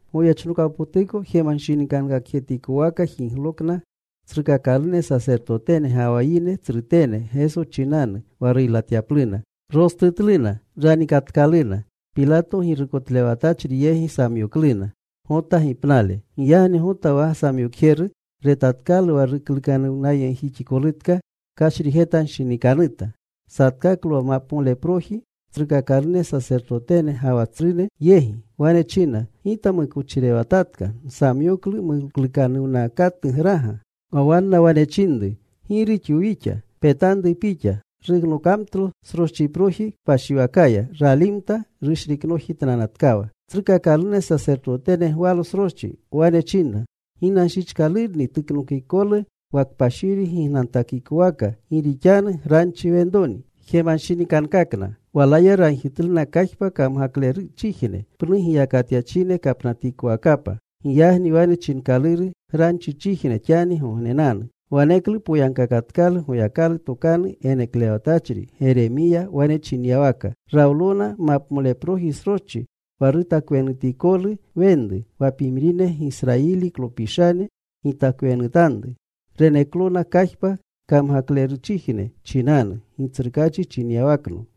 Goyechnokawpotuko jemanshinikankakjetikowaka jiglokna tsrukakalune sasertotene ga wa yine tsrutene Geso chinanu, wa ruylatyapluna. Rostutluna. Ranikatkaluna. Pilato girukotlewatachri yegi samyokluna. Giyagni Gota wa samyokjeru retatkalu wa ruklukanuwnayegjixikolutka, kashrijetanshinikanuta. Satkaklo wa mapamoleproji tsrukakalune sasertotene ga wa tsrune yegi. Wane china, “Gita mukochirewatatka. Nsamyoklu muklukanuwnakatugraga.” Wa wanna wane chinru, “¿Gi rixwu wixa? Petanru pixa.” Ruknokamtlo sroschiproji kpashiwakaya. Ralimta. Rushriknojitnanatkawa. Tsrukaklune sasertotene gwalo sroschi. Wane chinna, “Ginanshichkalurni tuknokikolu wa kpashiri gignantakikowaka, gi rixanu granchi wenroni.” Jemanshinikankakna. Walaya ragjitluna kajpa kamgakleruchijne, pnu giyakatyachine kapnatikowakapa. Giyagni wane chinkaluru Granchichijne xanigognenanu. Waneklu poyagkakatkalu Goyakalu tokanu geneklewatachri Geremiya wane chinyawaka: Rawlona mapmoleproji sroschi wa rutakwenutikolu wenru, wa pimrine Gisrayiliklopishane gitakwenutanru. Reneklona kajpa kamgakleruchijne chinanu, Gitsrukaachi chinyawakno.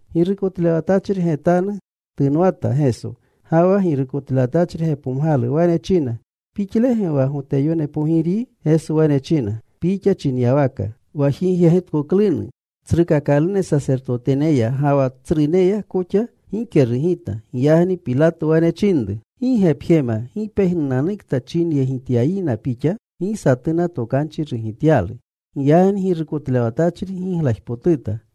Girukotlewatachri getanu tunwata Geso. Ga wa girukotlewatachri gepomgalu. Wane china, “¿Pixlege wa Goteyone Pogiryi?” Geso wane china, “Pixa chinyawaka.” Wa jigyegitkoklunu tsrukakalune sasertoteneya ga wa tsruneya koxa, gike rugita. Giyagni Pilato wane chinru, “¿Gi ge pjema gi pejnupiranananukta jigyegityayina Pixa?” Gi satuna tokanchi rugityalu. Giyagni girukotlewatachri giglajpotuta.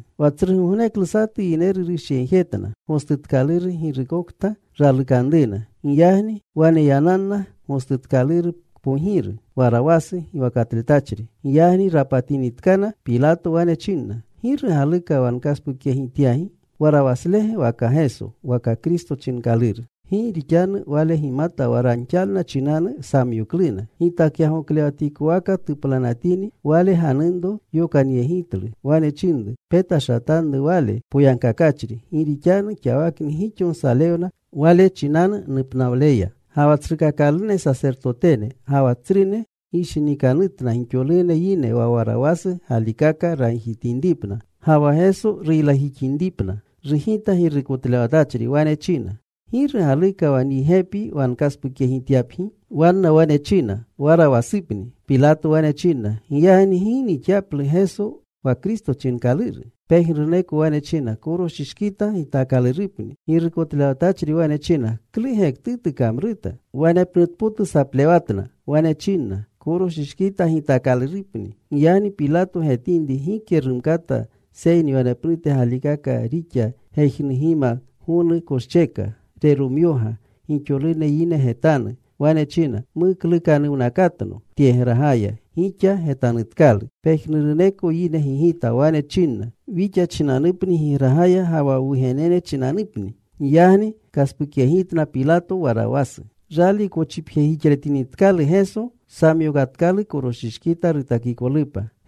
Wa tsrugogneklu satu yineru rushyegjetna gostutkaluru girukokta ralukanruna. Giyagni waneyananna gostutkaluru kpogiru, Warawasu giwakatletachri. Giyagni rapatinitkana, Pilato wane chinna, “¿Giru galuka wa nkaspukyegityapgi? ¿Warawaslege waka Geso wa Kristo chinkaluru?” Gi rixanu wale gimata wa ranxalna chinanu samyokluna. Gitakyagoklewatikowaka tuplanatini wale, ganunro yokantokanyegitlu. Wane chinru, “Petashatanru Wale poyagkakachri. Gi rixanu xawakni gixo nsalewna Wale chinanu nupnawleya.” Ga wa tsrukakalune sasertotene ga wa tsrune gishinikanutna gixolune yine wa Warawasu galikaka ragjitinripna, ga wa Geso ruylajixinripna. Rugita girukotlewatachri. Wane china, “¿Giru galuka wa nyi gepi wa nkaspukyegityapgi?” Wanna wane china, “Warawasupni.” Pilato wane chinna, “Giyagni ¿gi nixyaplu Geso wa Kristo chinkaluru?” Pejnuruneko wane china, “¡Koroshishkita gitaakalurupa!” Girukotlewatachri wane china, “¿Klu gektutu kamruta?” Wanepnute potu tsaplewatna. Wane chinna, “Koroshishkita gitaakalurupni.” Giyagni Pilato getinri gike rumkata, seyni wanepnute galikaka rixa gejnugima, gonu koscheka. Reromyoga gixolune yine getanu. Wane china, “Muklukanuwnakatno tyegragaya. Gixa getanutkalu.” Pejnuruneko yine gigita. Wane chinna, “Wixa chinanupni gigragaya, ga wa wwugenene chinanupni.” Giyagni kaspukyegitna Pilato Warawasu. Rali kochipjetjixletinitkalu Geso, samyokatkalu koroshishkita rutakikolupa.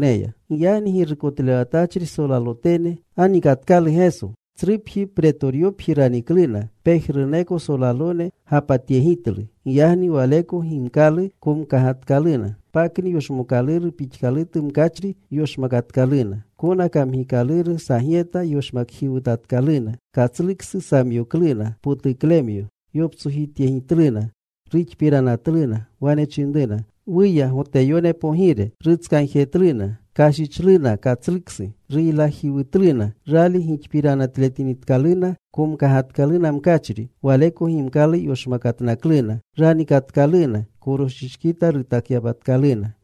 Giyagni girukotlewatachri solalotene ganikatkalu Geso. Tsrupji Pretoryopji ranikluna. Pejnuruneko solalone gapatyegitlu. Giyagni Waleko gimkalu komkagatkaluna. Pakni yoshmookaluru pixkalutu mkachri yoshmakatkaluna. Kona kamgikaluru sagyeta yoshmakjiwutatkaluna. Katsluksu samyokluna, potuklemyo. Yoptsojityegitluna. Ruxpiranatluna. Wane chinruna, “¡Wuya, Goteyone pogire!” Rutskagjetluna. Kashichluna katsluksu. Ruylajiwutluna. Rali gixpiranatletinikaluna, komkagatkaluna mkachri. Waleko gimkalu yoshmakatnakluna. Ranikatkaluna, koroshishkita rutakyapatkaluna.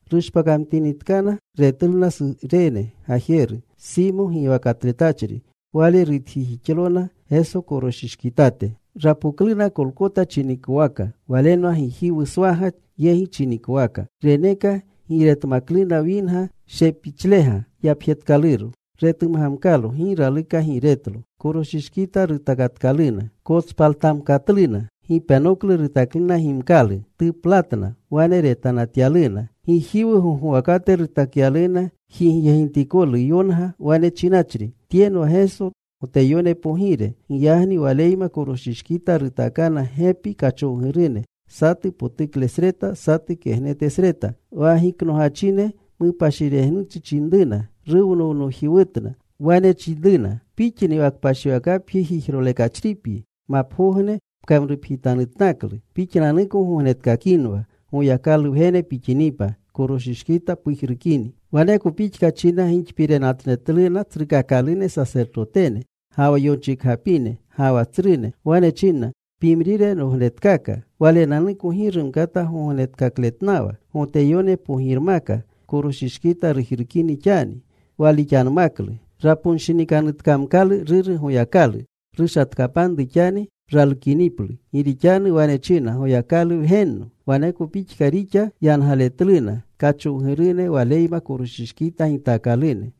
Rushpakamtinitkana. Retluna Surene gajeru, Simo giwakatletachri. Wale rutjijixlona Geso koroshishkitate. Rapokluna Kolkota chinikowaka. Walenwa Gijiwuswaga yegi chinikowaka. Reneka giiretmakluna winga shepichlega yapjetkaluro. Retumgamkalo. Gi raluka giiretlo. Koroshishkita rutakatkaluna. Kotspaltamkatluna. Gipenoklu rutakluna gimkalu. Tuplatna. Wane retanatyaluna. Gijiwu gogwakate rutakyaluna jigyegitikolu yonga, wane chinachri: Tyenwa Geso Goteyone Pogire. Giyagni Waleyma koroshshkita rutaakana gepi kachowgurune, satu potuklesreta, satu kegnetesreta. Wa giknogachine mupashiregnuchi chinruna. Ruwnownojiwutna. Wane chinruna, “Pixni wa kpashiwakapji jijrolekachripyi, mapagogne pkamrupjitanutnaklu. Pixnanuko gognetkakinwa. Goyakalu Wgene pixinipa, koroshishkita pujrukini.” Waneko pixka china gixpiranatletluna tsrukakalune sasertotene, ga wa yonchikgapine, ga wa tsrune. Wane chinna, “Pimrine rognetkaka. Walenanuko gi rumkata gognetkakletnawa. Goteyone Pogirmaka, koroshishkita rujrukini xani. Walixanmaklu. Raponshinikanutkamkalu Ruru Goyakalu. Rushatkapanru xani ralukiniplu. Gi rixanu wane china, ‘Goyakalu Wgenno.’” Waneko pixka rixa yangaletluna kachowgurune Waleyma koroshishkita gitaakalune.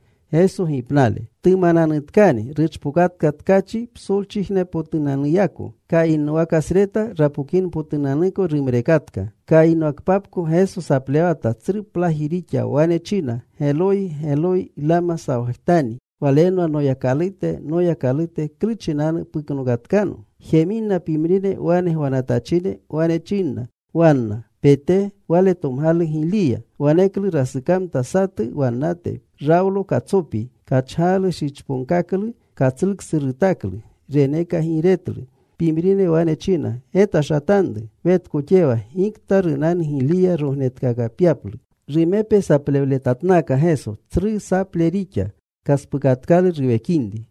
Tumananutkani ruchpokatka tkachi psolchijnepotunanuyako. Kayinwakasreta rapokinpotunanuko rumrekatka. Kayinwakpapko Geso saplewata. Tsru plaji rixa. Wane china, “Geloyi, Geloyi, ¿Lama sawajtani?” Walenwa, “Noyakalute, Noyakalute, ¿klu chinanu puknokatkano?” Jeminrina pimrine wane gwanatachine, wane chinna wanna, “Pete. Wale tomgalu Giliya.” Waneklu rasukamta satu wannate. Rawlo katsopi. Kachgalu shichponkaklu. Katsluksu rutaklu. Reneka giiretlu. Pimrine wane china, “Getashatanru. Wetkoxewa gikta runanu Giliya rognetkakapyaplu.” Rumepe saplewletatnaka Geso. Tsru saple rixa. Kaspukatkalu ruwekinri.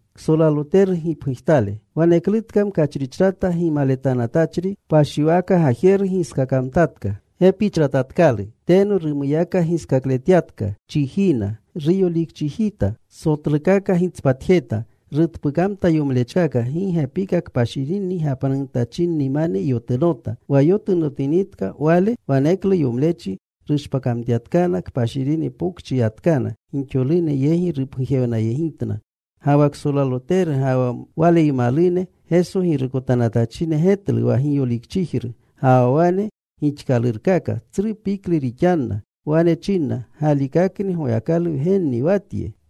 Waneklutka mkachrichrata gimaletanatachri kpashiwaka gajeru giskakamtatka. Gepichratatkalu. Teno rumuyaka giskakletyatka chijiina. Ruyolikchijita. Sotlukaka gitspatjeta. Rutpukamta yomlechkaka. Gi gepika kpashirinni gapnanutachinnimane yotunota. Wa yotunotinitka Wale, waneklu yomlechi rushpakyatkana. Kpashiri pokchi yatkana. Gixolune yegi rupgujewnayegitna. Ga wa ksolaloteru ga wa waleymalune Geso girukotanatachine getlu wa giyolikchijru, ga wa wane gixkalurkaka. Tsru piklu rixanna. Wane chinna, “Galikakni Goyakalu Wgenni wa tye.”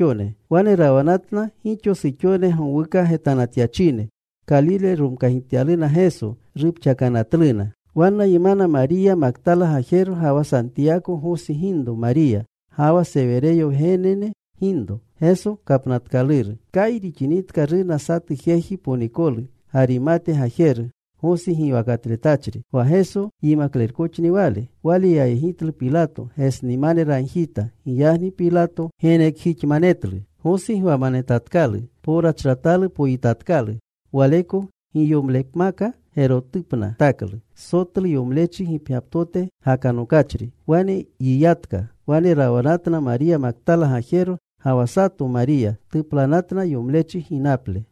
Wane rawanatna gixo suxone gowuka getanatyachine. Kalile romkagityaluna Geso. Rupxakanatluna. Wannaymana Mariya Maktala gajero, ga wa Santiyako, Gosi ginro Mariya, ga wa Sewereyo wgenene ginro. Kayi rixinitka runa satu jeji ponikolu, Garimate gajeru. Gosi giwakatletachri. Wa Geso yimaklerkoxni wale. Wale yayegitlu Pilato. Gesnimane ragjita. Giyagni Pilato genekjixmanetlu. Gosi gwamanetatkalu. Powrachratalu poyitatkalu. Waleko giyomlepmaka gerotupna rutaklu, sotlu yomlechi gipgyaptote gakanokachri. Wane yiyatka. Wane rawanatna Mariya Maktala gajero, ga wa sato Mariya. Tuplanatna yomlechi ginaple.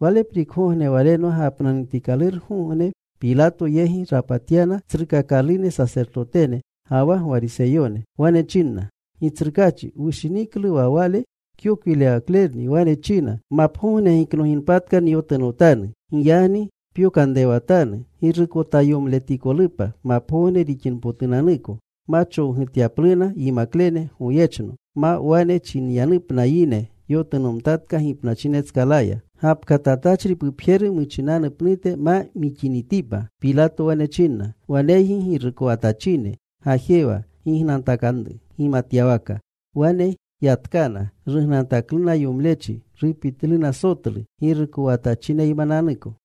Waleprikgogne, walenwa gapnanutikalurgogne, Pilato yegi rapatyana tsrukakalune sasertotene ga wa Gwariseyone. Wane chinna, “Gitsrukaachi, wushiniklu wa wale kyokwirewaklerni wane china, ‘Mapagogne giknoginpatka nyotunotanu.’ Giyagni pyokanrewatanu girukotayomletikolupa mapgogne rixinpotunanuko, ma chowgutapyapluna yimaklene goyechno, ma wane chinyanupna yine, ‘Yotunomtatka gipnachinetskalaya.’ Gapkatatachri pupjeru muchinanu pnute ma mixinitipa.” Pilato wane chinna, “Waneygi girukowatachine. Gajewa. Gignantakanru gimatyawaka.” Wane yatkana. Rugnantakluna yomlechi. Rupitluna sotlu, girukowatachineymananuko.